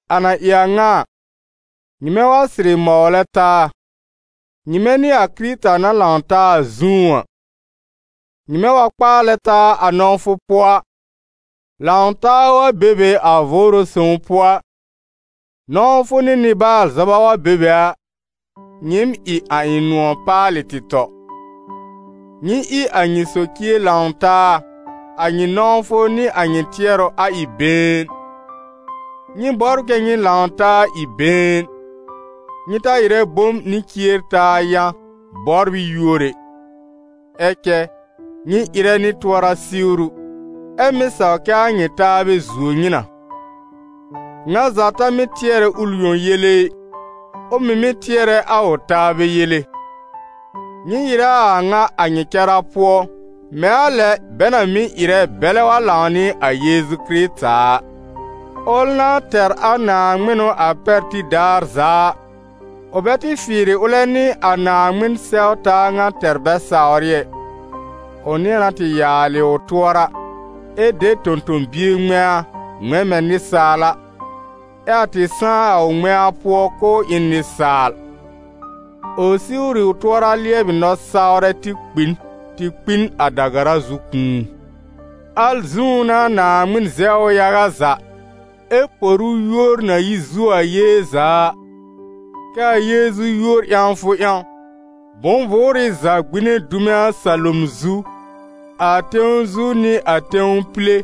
A na ɩ a ŋa a, nyɩmɛ wa sɩrɩ mɔwlɛ taa, nyɩmɛ nɩ a Kɩrɩta na lãw taa a zũú a, nyɩmɛ wa kpaalɛ taa a nɔ̃wfʋ pʋɔ a, lãw-taa wa be be a Vʋʋrʋ Sõw pʋɔ a, nɔ̃wfʋ nɩ nɩ-baal-zɔba wa be be a, nyɩɩm ɩ a ɩ̃ nʋ̃ɔ̀ paalɩ tɩ tɔ. Nyɩ ɩ a nyɩ socie lãw taa, a nyɩ nɔ̃wfʋ nɩ a nyɩ tɩɛrʋ a ɩ been. Nyɩ bɔbr kɛ́ nyɩ lãw taa ɩ been. Nyɩ ta ɩrɛ bom nɩ cier-taa yã, bɔbr ɩ yúor ɛ. Ɛ cɛ, nyɩ ɩrɛ nɩ tʋɔra-siwru, ɛ́ mɩ́ saw kɛ a nyɩ taabɛ zuo nyɩ na. Ŋa za ta mɩ́ tɩɛrɛ ʋl yõ yele ɩ, ʋ mɩ̀ mɩ́ tɩɛrɛ a ʋ taabɛ yele. Nyɩ ɩrɛ a a ŋa a nyɩ cara pʋɔ, mɛ̃ a lɛ bɛ na mɩ́ ɩrɛ bɛlɛ wa lãw nɩ a Yeezu Kɩrɩta a. Ʋl na tɛr a naaŋmɩnʋ a pɛr tib daar za a, ʋ bɛ tɩ fɩɩrɩ ʋlɛ nɩ a Naaŋmɩn sɛw-taa ŋa tɛr bɛ sawr ɩ ɛ. Ʋ nɩ̃ɛ na tɩ yàalɩ ʋ tʋɔra, ɛ de tõ-tõ-bie ŋmɛ̃a, ŋmɛ̃ mɛ̃ nɩsaal a, ɛ a tɩ sãá a ʋ ŋmɛ̃a pʋɔ k'ʋʋ ɩ n nɩsaal. Ʋ siwr ɩ ʋ tʋɔra lɩɛbɩ nɔ-sawrɛ tɩ kpi n, tɩ kpi n a da-gara zu kũu. Al zũú n'a Naaŋmɩn zɛw ʋ yaga za, ɛ por ʋ yúor na yi zuo a yée za a, kɛ a Yeezu yúor ƴãwfʋ ƴãw, bʋ̃-vʋʋrɩ za gbine dume a salom zu, a tẽw zu nɩ a tẽw pile,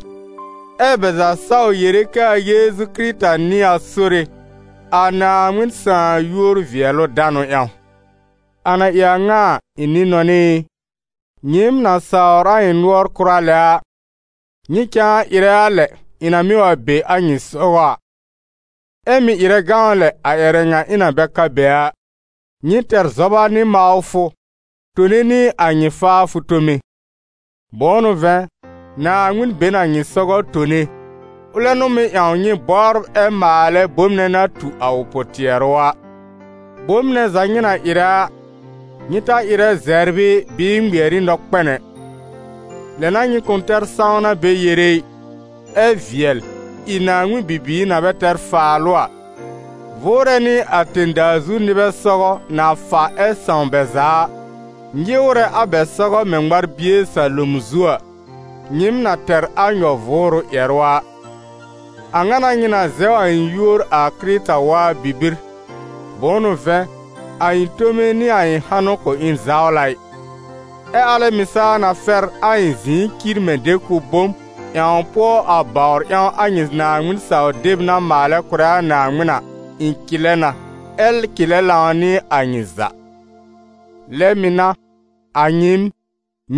ɛ́ bɛ za saw yere kɛ a Yeezu Kɩrɩta n'ɩ a Sore, a Naaŋmɩn sãà yúor-vɩɛlʋ-danʋ ƴãw. A na ɩ a ŋa a, ɩ̃ nɩ-nɔnɩ ɩ, nyɩɩm na sawr a ɩ̃ nʋɔr kʋra lɛ a, nyɩ cãa ɩrɛ a lɛ, ɩ̃ na mɩ́ wa be a nyɩ sɔgɔ a, ɛ mɩ̀ ɩrɛ gãw lɛ a ƴɛrɛ ŋa ɩ̃ na bɛ ka be a. Nyɩ tɛr zɔba nɩ mawfʋ, tone nɩ a nyɩ faafʋ tome. Bʋ̃ʋ n'ʋ vɛ̃, Naaŋmɩn be n a nyɩ sɔgɔ tone, ʋlɛ n'ʋ mɩ́ ƴãw nyɩ bɔbr ɛ maalɛ bom nɛ na tu a ʋ pʋ-tɩɛrʋ a. Bom nɛ za nyɩ na ɩrɛ a, nyɩ ta ɩrɛ zɛbr ɩ bɩɩ ŋmɩɛr ɩ nɔkpɛn ɛ; lɛ n'a nyɩ kʋ̃ tɛr sãwna bɛ yere ɩ, ɛ vɩɛl, ɩ Naaŋmɩn bibiir na bɛ tɛr faalʋ a, vʋʋrɛ nɩ a tẽ-daa zu nɩbɛ sɔgɔ, na fa ɛ sãw bɛ za a, nyɩwrɛ a bɛ sɔgɔ mɛ̃ ŋmar-bie salom zu a, nyɩɩm na tɛr a nyɔ-vʋʋrʋ ƴɛrʋ a: a ŋa n'a nyɩ na zɛw a ɩ̃ yúor a Kɩrɩta waa bibir, bʋ̃ʋ n'ʋ vɛ̃, a ɩ̃ tome nɩ a ɩ̃ hanʋ kʋ̃ ɩ zawla ɩ. Ɛ́ alɛ mɩ̀ saa na fɛr a ɩ̃ zɩ̃ɩ cir mɛ̃ dekʋb-bom, ƴãw pʋɔ a bawr ƴãw a nyɩ Naaŋmɩn-saw-deb na maalɛ kʋ̀rɛ a Naaŋmɩn a, ɩ̃ cɩlɛ na, ɛ́ cɩlɛ lãw nɩ a nyɩ za. Lɛ mɩ̀ n'a, a nyɩɩm,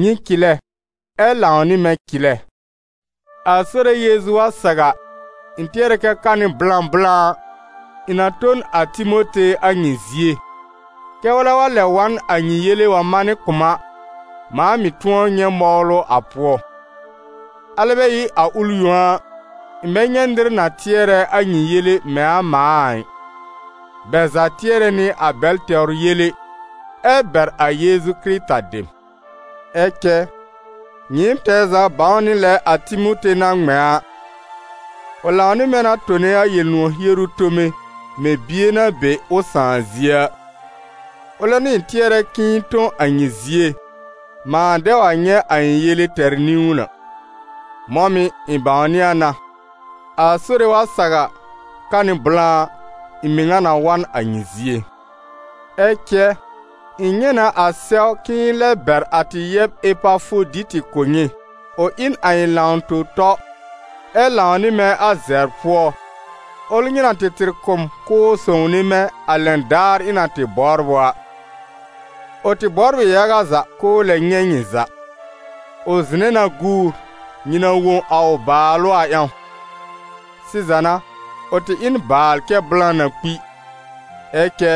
nyɩ cɩlɛ, ɛ́ lãw nɩ mɛ̃ cɩlɛ. A Sore Yeezu wa saw a, ɩ̃ tɩɛrɛ na kɛ ka nɩ blã blã a, ɩ̃ na tõ n a Timote a nyɩ zie, kɛ́ ʋlɛ wa lɛb wa n a nyɩ yele wa manɩ kʋ̀ m a, mãa mɩ̀ tʋ̃ɔ nyɛ̃ mɔwlʋ a pʋɔ. Alɛ bɛ ɩ a ʋl yõ a, ɩ̃ bɛ nyɛ̃ nɩr na tɩɛrɛ a nyɩ yele mɛ̃ a mãa a ɩ: bɛ za tɩɛrɛ nɩ a bɛl tɛwr yele, ɛ bɛr a Yeezu Kɩrɩta dem. Ɛ cɛ, nyɩɩm tɛɛ za bãw nɩ lɛ a Timote na ŋmɛ̃ a: ʋ lãw nɩ mɛ̃ na tone a Yel-nʋ̃ɔ̀ hieru tome mɛ̃ bie na be ʋ sãà zie a. Ʋlɛ n'ʋ ɩ̃ tɩɛrɛ k'ɩ̃ɩ tõ a nyɩ zie, mãa dɛ wa nyɛ̃ a ɩ̃ yele tɛr niwn a. Mɔ̃ mɩ̀, ɩ̃ bãwnɩ a na, a Sore wa saw a, ka nɩ blã a, ɩ̃ mɩŋa na wa n a nyɩ zie. Ɛ cɛ, ɩ̃ nyɛ̃ na a sɛw k'ɩ̃ɩ lɛb bɛr a tɩ yɛb Epafoditɩ kʋ̀ nyɩ, ʋ ɩ n a ɩ̃ lãw-tõ-tɔ, ɛ lãw nɩ mɛ̃ a zɛbr pʋɔ, ʋl nyɩ na tɩ tɩr kʋ̀ m k'ʋʋ sõwne mɛ̃, a lɛn daar ɩ̃ na tɩ bɔbr ʋ a. Ʋ tɩ bɔbr ɩ yaga za k'ʋʋ lɛ nyɛ̃ nyɩ za; ʋ zɩ̃nɛ na guur, nyɩ na wõ a ʋ bàalʋ a ƴãw. Sɩza n'a, ʋ tɩ ɩ n baal cɛ blã na kpi. Ɛ cɛ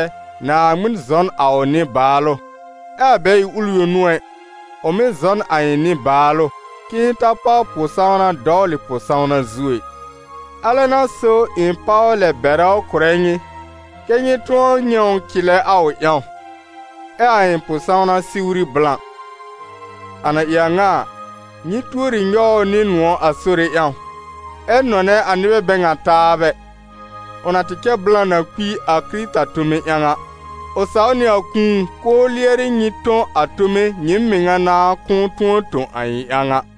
Naaŋmɩn zɔ n a ʋ nɩ-baalʋ, ɛ a bɛ ɩ ʋl yõ n'ʋ ɛ, ʋ mɩ̀ zɔ n a ɩ̃ nɩ-baalʋ, k'ɩ̃ɩ ta páw pʋ-sãwna dɔwlɩ pʋ-sãwna zu ɛ. Alɛ n'a so ɩ̃ páw lɛ bɛrɛ ʋ kʋrɛ nyɩ, kɛ́ nyɩ tʋ̃ɔ nyɛ̃ ʋ cɩlɛ a ʋ ƴãw, ɛ a ɩ̃ pʋ-sãwna siwri blã. A na ɩ a ŋa a, nyɩ tuori nyɔw ʋ nɩ nʋ̃ɔ̀ a Sore ƴãw, ɛ nɔnɛ a nɩbɛ bɛ ŋa taabɛ, ʋ na tɩ cɛ blã na kpi a Kɩrɩta tome ƴãw a; ʋ saw nɩ a kũu, k'ʋʋ lɩɛrɩ nyɩ tõ a tome nyɩɩm mɩŋa nãá kʋ̃ʋ tʋ̃ɔ tõ a ɩ̃ ƴãw a.